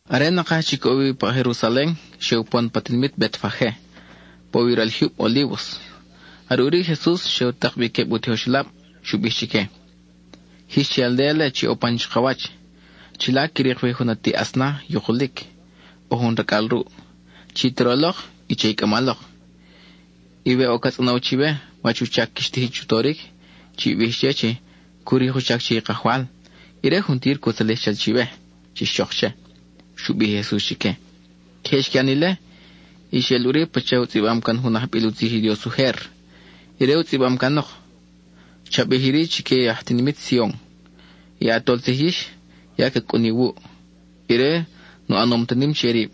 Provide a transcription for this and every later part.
Are nakaj chic je ʼo wi pa Jerusalen, xe upon pa tinimit Betfage, pa ʼo wi i ral jyub Olívos. Are ʼuri i Jesus xe u tak bi queb u tijoxelab, xu bij chique: —Jix che i aldéa-le chi ʼo pan chakawach. Chila qui rik wi jun ati asna yukulic, ʼo jun racʼal ruʼ. Chi toro lok, y che i cʼama lok. Y we ʼo ca tzʼonow chiwe wach u chac quix tijin chu toric, chi bij che chi cu rik u chac che i Kajwal, y ire juntir cu tzalij chal chawe, chix chok che —xu bij Jesus chique. Queje xqui ʼan ile, y xeʼel ʼuri pacha u tzʼibam can jun ajbil u tzij i Dios ujer. Ire u tzʼibam canok: Cha bij iri chique i aj tinimit Sion: “I ʼatol tzij yix ya ca cʼun iwuʼ. Ire nu ʼanom ta nim che rib,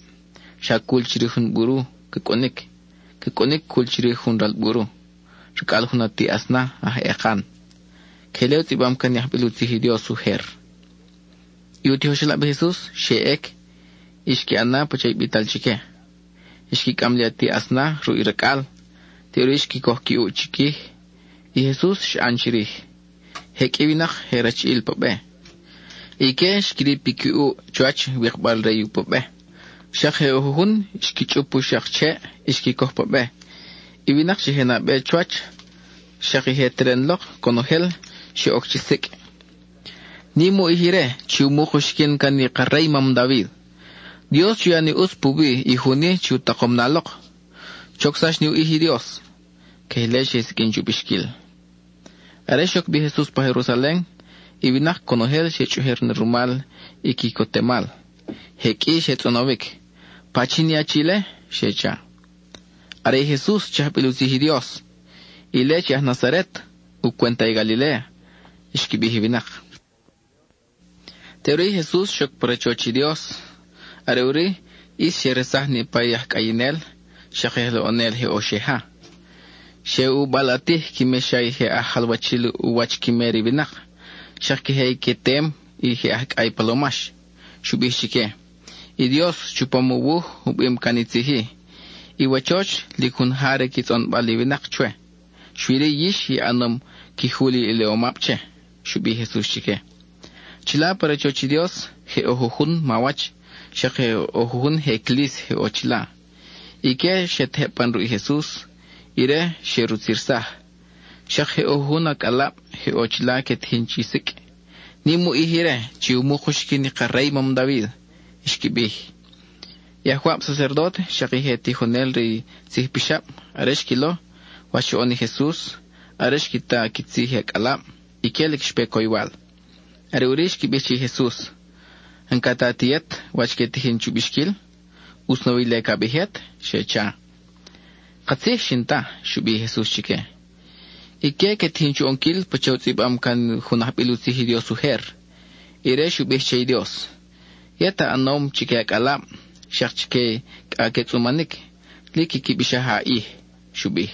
xa cul chirij jun buru ca cʼunic; ca cʼunic cul chirij jun ral buru, racʼal jun ati asna aj ekan.” (Queje ile u tzʼibam can i ajbil u tzij i Dios ujer.) I u tijoxelab i Jesus xe ʼec y xqui ʼan na pacha i bital chique. Xqui cʼam li ati asna ruʼ i racʼal. Teʼuri xqui coj qui ʼuʼ chiquij; i Jesus xa ʼan chirij. Je qʼui i winak je rachiʼil pa be; ique xqui rip i qui ʼuʼ chuwach, wikbal re i pu be. Xak je ʼo jujun xqui chʼup u xak cheʼ y xqui coj pa be. I winak chi je nabe chuwach, xak i je teren lok, conojel xe oc chi sicʼ: —¡Nim u ʼij ire chi umuk uxiquin i ka rey mam David! ¡Dios chu ya ni ʼutz puwi i jun-i chi u takom na lok! ¡Chocsax ni u ʼij i Dios! (Queje ile xe siqʼuin chu bixquil.) Are xoc bi i Jesus pa Jerusalen, i winak conojel xe chʼujer na rumal i quicotemal. Je qʼui xe tzʼonowic: —¿Pachin i achi-le? —xe cha. —Are i Jesus, chi ajbil u tzij i Dios; ile chi aj Nazaret, u cwenta i Galiléa —xqui bij i winak. Teʼuri i Jesus xoc pa rachoch i Dios; are ʼuri ʼis xe resaj niʼpa i aj cʼayinel xak i aj loʼonel je ʼo xe ja. Xe u balʼatij qui mexa i je aj jalwachil u wach qui mer i winak, xak queje i qui tem i je aj cʼay palomax. Xu bij chique: —I Dios, chupam u wuj, u bim can i tzij-i: “I wachoch, lic jun ja re qui tzʼonbal i winak chwe”; xui-ri yix i ʼanom qui jul iliʼomab che —xu bij i Jesus chique. Chila pa rachoch i Dios je ʼo jujun mawach, xak je ʼo jujun je clis je ʼo chila. Ique xe tejeb pan ruʼ i Jesus, y ire xe rutzirsaj. Xak je ʼo jujun acʼalab je ʼo chila que tijin chi sicʼ: “¡Nim u ʼij ire chi umuk uxiquin i ka rey mam David!” xqui bij. I ajwab sacerdóte, xak i je tijonel re i tzij pixab, are xquilo wach xoʼon i Jesus, are xqui ta qui tzij i acʼalab, ique lic xpe coywal. Are ʼuri xqui bij che i Jesus: —¿N-ca ta ti yet wach que tijin chu bixquil? ¿ʼUtz nawi ile, ca bij yet? —xe cha. —Katzij xin ta —xu bij i Jesus chique—. Ique que tijin chu ʼonquil pacha u tzʼibam can jun ajbil u tzij i Dios ujer. Ire xu bij che i Dios: Yet a ʼanom chique i acʼalab, xak chique i cʼa que tzʼumanic lic quiqui bixaj a ʼij (—xu bij).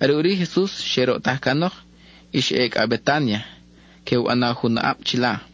Are ʼuri i Jesus xe roʼtaj canok y xa ʼe cʼa Betánia, que u ʼana jun aʼab chila.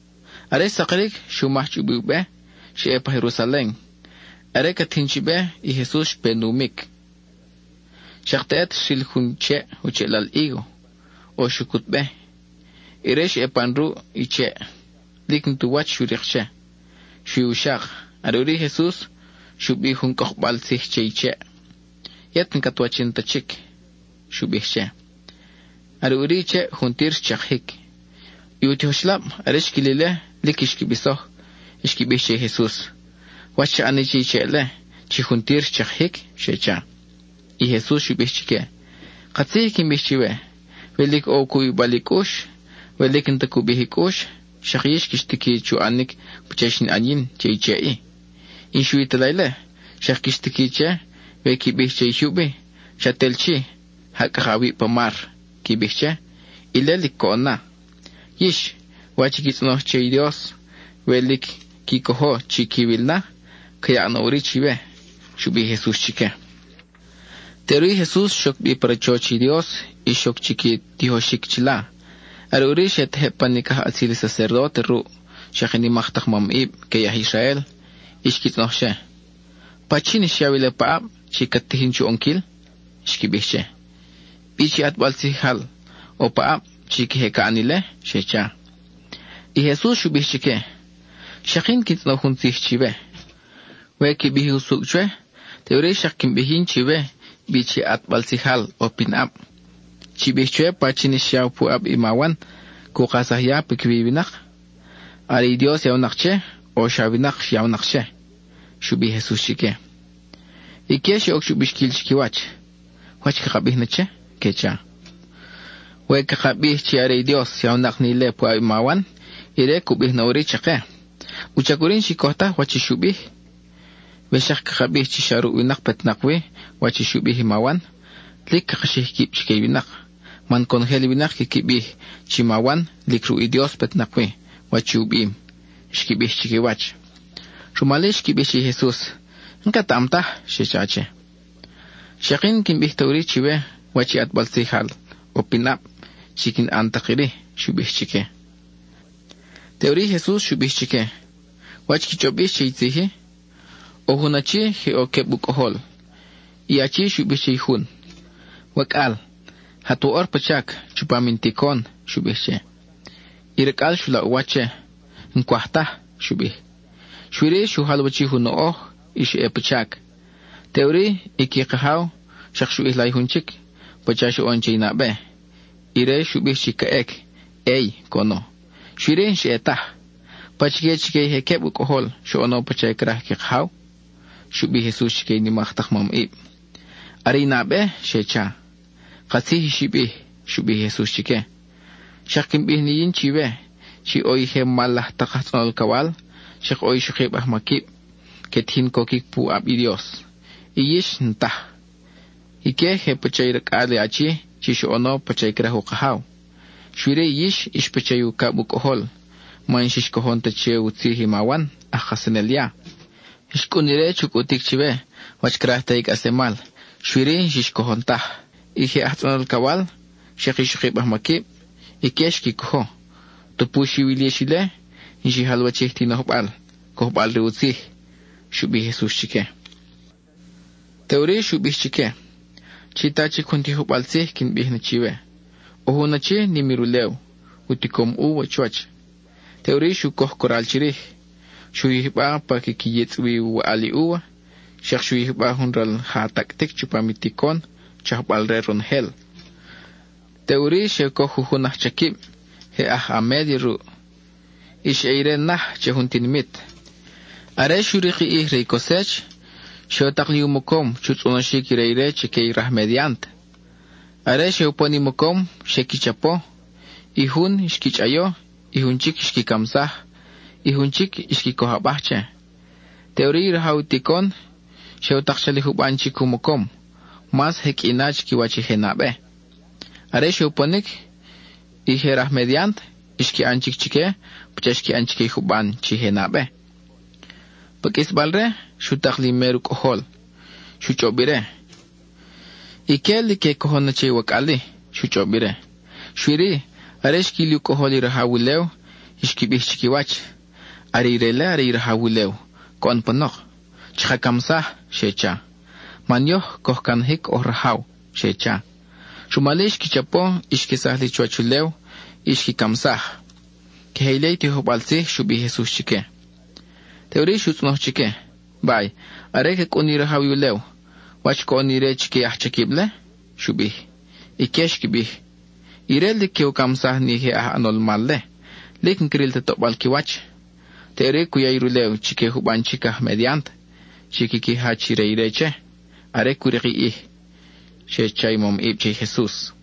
Are xsakiric, xu maj chubi u be, xa ʼe pa Jerusalen. Are ca tijin chi be, i Jesus xpe u numic. Xak teʼet xril jun cheʼ, u cheʼlal hígo, ʼo xucut be. Ire xa ʼe pan ruʼ i cheʼ; lic n-ti u wach xu rik che, xui u xak. Are ʼuri i Jesus xu bij jun cʼokbal tzij che i cheʼ: —¡Yet n-cat wachin ta chic! —xu bij che. Are ʼuri i cheʼ juntir xchakijic. I u tijoxelab, are xquil ile, lic xqui bisoj. Xqui bij che i Jesus: —¿Wach xa ʼani che i cheʼ-le, chi juntir xchakijic? —xe cha. I Jesus xu bij chique: —Katzij i quin bij chiwe, we lic ʼo u cubibal i cʼux, we lic n-ta cu bij i cʼux, xak yix quix tiqui chu ʼanic pacha i xin ʼan yin che i che-i. Y n-xui ta la ile, xak quix tiqui che, we qui bij che i jyub-i, “Chat el chi, ja cʼaka awib pa mar,” qui bij che, ile lic coʼon na. Yix, wach i qui tzʼonoj che i Dios, we lic qui cojo chi quiwil na, ca yaʼ na ʼuri chiwe —xu bij i Jesus chique. Teʼuri i Jesus xoc chic pa rachoch i Dios y xoc chi qui tijoxic chila. Are ʼuri xe tejeb pan i cajʼatzil i sacerdóte ruʼ, xak i nimak tak mamʼib que i aj Israel, y xqui tzʼonoj che: —¿Pachin xyaw ile paʼab chi cat tijin chu ʼonquil? —xqui bij che—. ¿Bi chi ʼatbal tzijal ʼo paʼab, chi queje ca ʼan ile? —xe cha. I Jesus xu bij chique: —Xak yin quin tzʼonoj jun tzij chiwe. We qui bij usucʼ chwe, teʼuri xak quin bij yin chiwe bi chi ʼatbal tzijal ʼo pinʼab. Chi bij chwe pachin xyaw puʼab i ma Wan cu kajsaj ya piquiwi i winak. ¿Are i Dios yawnak che, o xa winak yawnak che? —xu bij i Jesus chique. Ique xe oc chu bixquil chiquiwach: —¿Wach caka bij na che? —que cha—. We caka bij chi are i Dios yawnak ni ile puʼab i ma Wan, ire cu bij na ʼuri chake: “¿Wuchac ʼuri n-xi coj taj wach i xu bij?” We xak caka bij chi xa ruʼ winak petnak wi wach i xu bij i ma Wan, lic caka xij kib chique i winak; man conojel i winak quiqui bij chi ma Wan lic ruʼ i Dios petnak wi wach i u bim —xqui bij chiquiwach. Rumal-i xqui bij che i Jesus: —N-ketaʼam taj —xe cha che. —Xak yin n-quin bij ta ʼuri chiwe wach i ʼatbal tzij ʼo pinʼab, chi quin ʼan tak iri —xu bij chique. Teʼuri i Jesus xu bij chique: —¿Wach qui chʼob yix che i tzij-i? ʼO jun achi, je ʼo queb u cʼojol. I achi xu bij che i jun: “Wacʼal, jat woʼor pa chac chupam in ticon,” xu bij che. I racʼal xu laʼ u wach che: “N-cwaj taj,” xu bij. Xui-ri, xu jalwachij u noʼoj y xa ʼe pa chac. Teʼuri i qui kajaw xak xu ʼijla i jun chic, pacha xoʼon che i nabe. Ire xu bij chi ca ʼec; “Ey,” coʼono, xui-ri, n-xa ʼe taj. ¿Pachique chique i je queb u cʼojol xoʼono pacha craj i qui kajaw? —xu bij i Jesus chique i nimak tak mamʼib. —Are i nabe —xe cha. —Katzij i xi bij —xu bij i Jesus chique—. Xak quin bij na yin chiwe chi ʼo i je mal laj tak aj tzʼonol alcawal, xak ʼo ixokib ajmaquib que tijin coquic puʼab i Dios, y yix n-taj. Ique je pacha i racʼal i achi chi xoʼono pacha craj u kajaw. Xui-ri yix ix pacha i ucab u cʼojol man n-xix cojon ta che u tzij i ma Wan aj kajsanel ya. Xcʼun ire chu cʼutic chiwe wach craj te i cʼaslemal, xui-ri n-xix cojon taj. I je aj tzʼonol alcawal, xak i ixokib ajmaquib, ique xqui cojo. Tupu xiwil yix ile, n-xi jalwachij ti nojbal, cojbal-re u tzij —xu bij i Jesus chique. Teʼuri xu bij chique: —Chi ta chic jun tijojbal tzij quin bij na chiwe. ʼO jun achi nim i rulew, u ticom úva chuwach. Teʼuri xu coj coral chirij; xu yijba pa quiqui yitzʼ wi u waʼal i úva, xak xu yijba jun ral ja tacʼtic chupam i ticon, chajbal-re ronojel. Teʼuri xe u coj jujun ajchaquib, je aj a média ruʼ; y xa ʼe ire naj che jun tinimit. Are xu rik i ʼij re i cosech, xe u tak li u mocom chu tzʼonoxic i re ire chique i raj mediant. Are xe upon i mocom, xe qui chapo. I jun, xqui chʼayo; i jun chic, xqui camsaj; i jun chic, xqui coj abaj che. Teʼuri i rajaw ticon xe u tak chali juban chic u mocom, mas je qʼui na chiquiwach i je nabe. Are xe uponic, i je raj mediant xqui ʼan chic chique pacha xqui ʼan chique i juban chi je nabe. Pa qʼuisbal-re, xu tak li i mer u cʼojol. Xu chʼob ire: “Ique lic que cojon na che i wacʼal-i,” xu chʼob ire. Xui-ri, are xquil i u cʼojol i rajaw ulew, xqui bij chiquiwach: “Are ire-le are i rajaw ulew coʼon panok; chaka camsaj,” xe cha, “man yoj coj canajic oj rajaw,” xe cha. Rumal-i xqui chapo, y xquesaj li chuwach ulew, y xqui camsaj. (Queje ile i tijojbal tzij xu bij i Jesus chique.) Teʼuri xu tzʼonoj chique: —Bay, are ca cʼun ni rajaw i ulew, ¿wach coʼon ni ire chique i ajchaquib-le? —xu bij. Ique xqui bij: —Ire lic que u camsaj ni je aj ʼanol mal-le; lic n-cril ta toʼbal qui wach. Teʼuri cu ya i rulew chique juban chic aj mediant, chi quiqui jach i re ire che, are cu rik i ʼij —xe cha i mamʼib che i Jesus.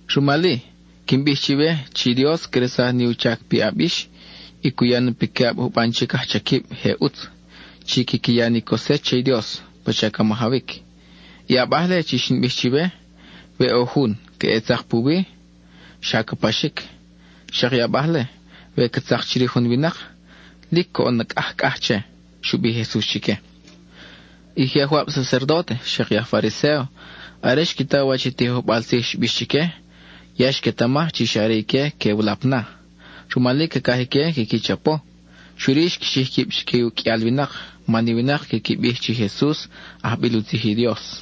Rumal-i, quin bij chiwe chi Dios cresaj ni u chac piʼab yix y cu ya na piquiʼab juban chic ajchaquib je ʼutz, chi quiqui ya ni cosech che i Dios pacha ca majawic. I abaj-le chi xin bij chiwe, we ʼo jun ca ʼe tzak puwi, xa ca paxic; xak i abaj-le, we ca tzak chirij jun winak, lic coʼon na cʼajcʼaj che —xu bij i Jesus chique. I je ajwab sacerdóte, xak i je aj Fariséo, are xqui ta wach i tijojbal tzij xbix chique, ya xquetamaj chi xa are ique que u lap na. Rumal-i cacaj ique quiqui chapo, xui-ri xqui xij quib chique i uqʼuial winak, man i winak quiqui bij chi Jesus ajbil u tzij i Dios.